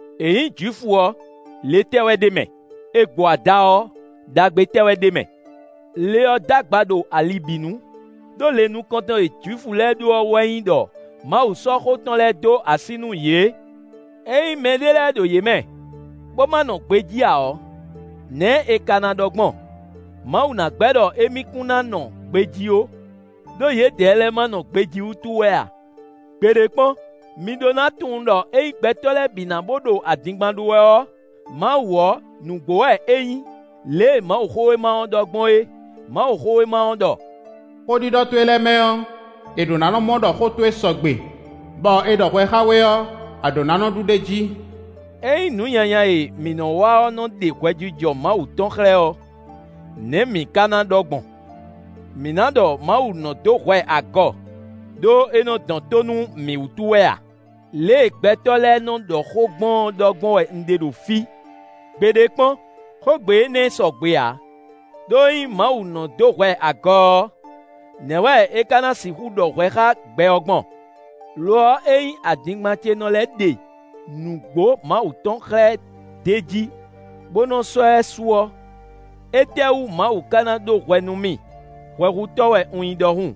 È nyǐ Jwifu ɔ́, le tɛ́ wɛ ɖ'é mɛ? È gbo ada ɔ́, ɖagbe tɛ́ wɛ ɖ'é mɛ? Le ɔ́ d'agba ɖo ali bǐ nu; ɖó le nukɔntɔn e Jwifu lɛ́ɛ ɖó ɔ́ wɛ nyí ɖɔ Mawu sɔ́ xó tɔn lɛ́ɛ dó así nú yě. Ényí mɛɖé lɛ́ɛ ɖo yě mɛ, bó ma nɔ gbejí ǎ ɔ́, nɛ̌ è ka ná ɖɔ gbɔn? Mawu ná gbɛ́ ɖɔ émí kún ná nɔ gbejí ó, ɖó yědɛɛ lɛ́ɛ ma nɔ gbejí wútu wɛ a? Gbeɖé kpɔ́n! Mi ɖó ná tunwun ɖɔ ényí gbɛtɔ́ lɛ́ɛ bǐ ná bo ɖo adingban ɖó wɛ ɔ́, Mawu ɔ́, nǔgbó wɛ é nyí, lě e Mawuxówéma ɔ́ ɖɔ gbɔn é; Mawuxówéma ɔ́ ɖɔ: “Xó ɖiɖɔ towe lɛ́ɛ mɛ ɔ́, è ɖǒ ná nɔ́ mɔ ɖɔ xó towe sɔgbe, bɔ è ɖɔ hwɛ xá we ɔ́, a ɖǒ ná nɔ́ ɖu ɖ'é jí.” Ényí nǔ nyanya e mǐ nɔ́ wa ɔ́ nɔ́ ɖe hwɛjijɔ Mawu tɔn xlɛ́ ɔ́, nɛ̌ mǐ ka ná ɖɔ gbɔn? Mǐ ná ɖɔ Mawu nɔ́ dó hwɛ agɔ, ɖó é nɔ́ dɔn tó nú mǐ wútu wɛ a? Lě e gbɛtɔ́ lɛ́ɛ nɔ́ ɖɔ xó gbɔn ɔ́ ɖɔ gbɔn wɛ un ɖe ɖo fí. Gbeɖé kpɔ́n! Xógbe énɛ́ sɔgbe ǎ; ɖó ényí Mawu nɔ́ dó hwɛ agɔ ɔ́, nɛ̌ wɛ é ka ná sixú ɖɔ hwɛ xá gbɛ ɔ́ gbɔn? Lo ɔ́, ényí adingban ce nɔ lɛ́ ɖe nǔgbó Mawu tɔn xlɛ́ d'é jí, bó nɔ́ sɔ́ ɛ su ɔ́, étɛ́ wú Mawu ka ná ɖó hwɛ nú mì hwɛhutɔ́ wɛ un nyí ɖɔhun?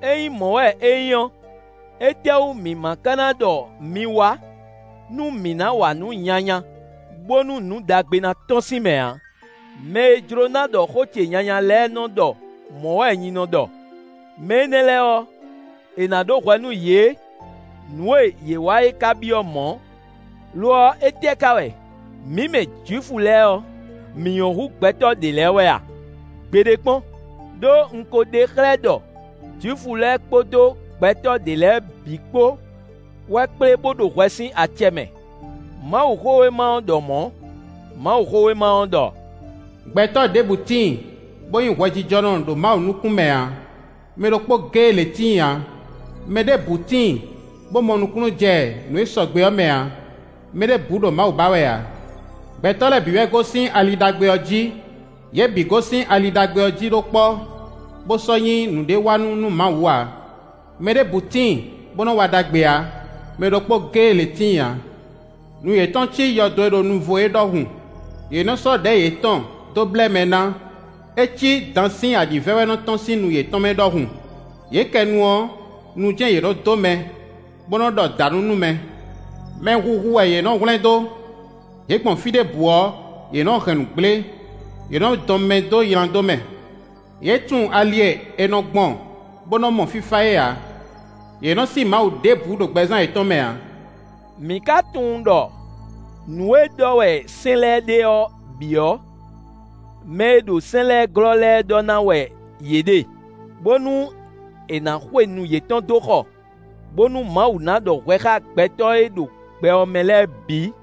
Ényí mɔ̌ wɛ é nyí ɔ́, étɛ́wú mǐ ma ka ná ɖɔ mi wá nú mǐ ná wa nǔ nyanya bónú nǔ ɖagbe ná tɔ́n sín mɛ ǎ? Mɛ e jló ná ɖɔ xó ce nyanya lɛ́ɛ nɔ́ ɖɔ mɔ̌ wɛ nyi nɔ ɖɔ. Mɛ énɛ́ lɛ́ɛ ɔ́, è nǎ ɖó hwɛ nú yě; nǔ e yě wa é ka byɔ́ mɔ̌. Lo ɔ́, étɛ́ ka wɛ? Mǐ mɛ Jwifu lɛ́ɛ ɔ́, mǐ nyɔ́ hú gbɛtɔ́ ɖě lɛ́ɛ wɛ a? Gbeɖé kpɔ́n! Đó un ko ɖe xlɛ́ ɖɔ Jwifu lɛ́ɛ kpódó gbɛtɔ́ ɖě lɛ́ɛ bǐ kpó wɛ kplé bó ɖo hwɛ sín acɛ mɛ. Mawuxówéma ɔ́ ɖɔ mɔ̌; Mawuxówéma ɔ́ ɖɔ: “Gbɛtɔ́ ɖěbǔ tíin, bó nyí hwɛjijɔnɔ ɖo Mawu nukún mɛ ǎ. Mɛ ɖokpó géé lě tíin ǎ. Mɛɖěbǔ tíin, bó mɔ nukúnnú jɛ nǔ e sɔgbe ɔ́ mɛ ǎ; mɛ ɖěbǔ ɖo Mawu ba wɛ ǎ. Gbɛtɔ́ lɛ́ɛ bǐ wɛ gosín ali ɖagbe ɔ́ jí; yě bǐ gosín ali ɖagbe ɔ́ jí ɖó kpɔ́, bó sɔ́ nyí nǔɖéwanú nú Mawu ǎ. Mɛɖěbǔ tíin bó nɔ́ wa ɖagbe ǎ; mɛ ɖokpó géé lě tíin ǎ. Nu yětɔn cí yɔdo e ɖo nuvo é ɖɔhun; yě nɔ sɔ́ ɖɛ̌ yětɔn dó blɛ́ mɛ ná. É cí dan sín aɖǐvɛ́ wɛ nɔ tɔ́n sín nu yětɔn mɛ ɖɔhun. Yě kɛ nu ɔ́, nu jɛ́n yě nɔ dó mɛ, bó nɔ́ ɖɔ dǎnǔ nú mɛ. Mɛhuhu wɛ yě nɔ́ hwlɛ́n dó. Yě gbɔn fí ɖěbǔ ɔ́, yě nɔ́ hɛn nǔ gblé; yě nɔ́ dɔn mɛ dó nyladó mɛ. Yě tunwun ali e è nɔ gbɔn bó nɔ́ mɔ fífá é ǎ. Yě nɔ́ sí Mawu ɖěbǔ ɖo gbɛzán yětɔn mɛ ǎ.” Mǐ ka tunwun ɖɔ nǔ e ɖɔ wɛ sɛ́n lɛ́ɛ ɖe ɔ́ bǐ ɔ́, mɛ e ɖo sɛ́n lɛ́ɛ glɔ́ lɛ́ɛ ɖɔ ná wɛ yě ɖe, bónú è nǎ xwe nu yětɔn dó xɔ, bónú Mawu ná ɖɔ hwɛ xá gbɛtɔ́ e ɖo gbɛ ɔ́ mɛ lɛ́ɛ bǐ.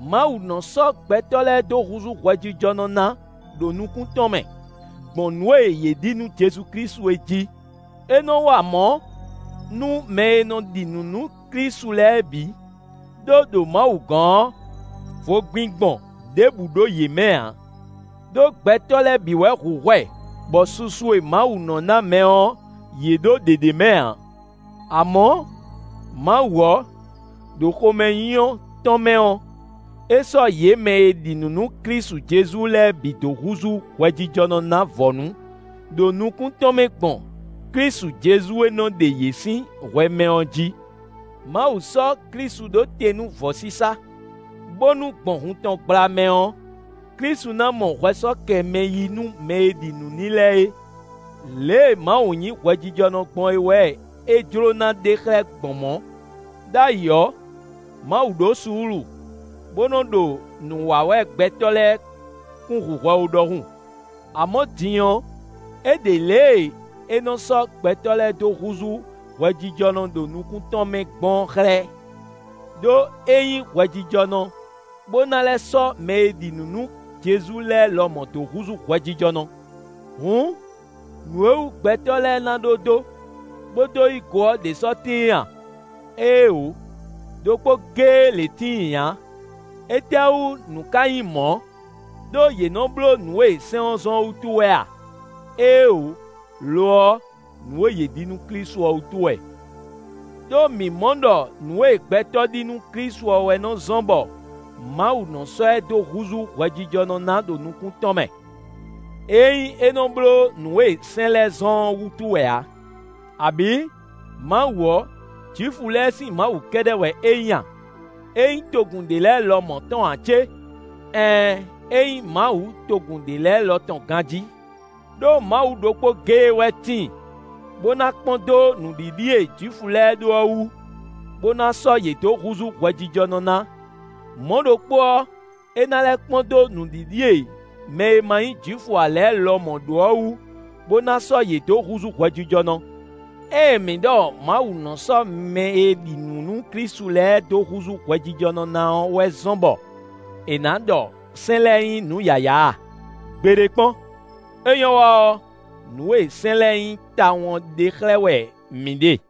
Mawu nɔ́ sɔ́ gbɛtɔ́ lɛ́ɛ dó húzú hwɛjijɔnɔ ná ɖo nukún tɔn mɛ, gbɔn nǔ e yě ɖi nú Jezu Klísu é jí. É nɔ wa mɔ̌ nú mɛ e nɔ ɖi nǔ nú Klísu lɛ́ɛ bǐ, ɖó ɖo Mawu gɔ́n ɔ́, vogbingbɔn ɖěbǔ ɖo yě mɛ ǎ. Đó gbɛtɔ́ lɛ́ɛ bǐ wɛ hu hwɛ bɔ susu e Mawu nɔ́ ná mɛ ɔ́, yě ɖó ɖě ɖ'é mɛ ǎ. Amɔ̌, Mawu ɔ́, ɖo xomɛnyínyɔ́ tɔn mɛ ɔ́, é sɔ́ yě mɛ e ɖi nǔ nú Klísu Jezu lɛ́ɛ bǐ dó húzú hwɛjijɔnɔ ná vɔ̌nu ɖo nukún tɔn mɛ gbɔn Klísu Jezu e nɔ ɖe yě sín hwɛ mɛ ɔ́ jí. Mawu sɔ́ Klísu ɖó te nú vɔ̌sísá, bónú gbɔn hun tɔn gbla mɛ ɔ́, Klísu ná mɔ hwɛ sɔ́ kɛ mɛ yí nú mɛ e ɖi nǔ n'i lɛ́ɛ é. Lě e Mawu nyí hwɛjijɔnɔ gbɔn é wɛ é jló ná ɖe xlɛ́ gbɔn mɔ̌. Đ'ayǐ ɔ́, Mawu ɖó suúlu, bó nɔ́ ɖo nǔ wa wɛ gbɛtɔ́ lɛ́ɛ kún hu hwɛ ó ɖɔhun. Amɔ̌, din ɔ́, é ɖe lě e é nɔ́ sɔ́ gbɛtɔ́ lɛ́ɛ dó húzú hwɛjijɔnɔ ɖo nukún tɔn mɛ gbɔn ɔ́ xlɛ́, ɖó é nyí hwɛjijɔnɔ, bó ná lɛ́ sɔ́ mɛ e ɖi nǔ nú Jezu lɛ́ɛ lɔmɔ̌ dó húzú hwɛjijɔnɔ. Hǔn, nǔ e wú gbɛtɔ́ lɛ́ɛ ná ɖó dó, bó dó yí go ɔ́ ɖě sɔ́ tíin a? Éeǒ! Đokpó géé lě tíin ǎ. Étɛ́wú nǔ ká nyí mɔ̌? Đó yě nɔ bló nǔ e sɛ́n ɔ́ zɔ́n ɔ́ wútu wɛ a? Éeǒ! Lo ɔ́, nǔ e yě ɖi nú Klísu ɔ́ wútu wɛ. Đó mǐ mɔ ɖɔ nǔ e gbɛtɔ́ ɖi nú Klísu ɔ́ wɛ nɔ zɔ́n bɔ Mawu nɔ́ sɔ́ ɛ dó húzú hwɛjijɔnɔ ná ɖo nukún tɔn mɛ; é nyí é nɔ bló nǔ e sɛ́n lɛ́ɛ zɔ́n ɔ́ wútu wɛ ǎ. Abǐ, Mawu ɔ́, Jwifu lɛ́ɛ sín Mawu kɛ́ɖɛ́ wɛ é nyí a? É nyí togun ɖě lɛ́ɛ lɔmɔ̌ tɔn ǎ cé? Ɛɛn, é nyí Mawu togun ɖě lɛ́ɛ lɔ tɔn ganjí. Đó Mawu ɖokpó géé wɛ tíin, bó ná kpɔ́n dó nǔɖiɖi e Jwifu lɛ́ɛ ɖó ɔ́ wú, bó ná sɔ́ yě dó húzú hwɛjijɔnɔ ná; mɔ̌ ɖokpó ɔ́, é ná lɛ́ kpɔ́n dó nǔɖiɖi e mɛ e ma nyí Jwifu ǎ lɛ́ɛ lɔmɔ̌ ɖó ɔ́ wú, bó ná sɔ́ yě dó húzú hwɛjijɔnɔ. Ée mǐ ɖɔ Mawu nɔ sɔ́ mɛ e ɖi nǔ nú Klísu lɛ́ɛ dó húzú hwɛjijɔnɔ na ɔ́ wɛ zɔ́n bɔ è nǎ ɖɔ sɛ́n lɛ́ɛ nyí nǔ yǎyá a? Gbeɖé kpɔ́n! É nyɔ́ wa ɔ́, nǔ e sɛ́n lɛ́ɛ nyí tawun ɔ́ ɖe xlɛ́ wɛ mǐ ɖe.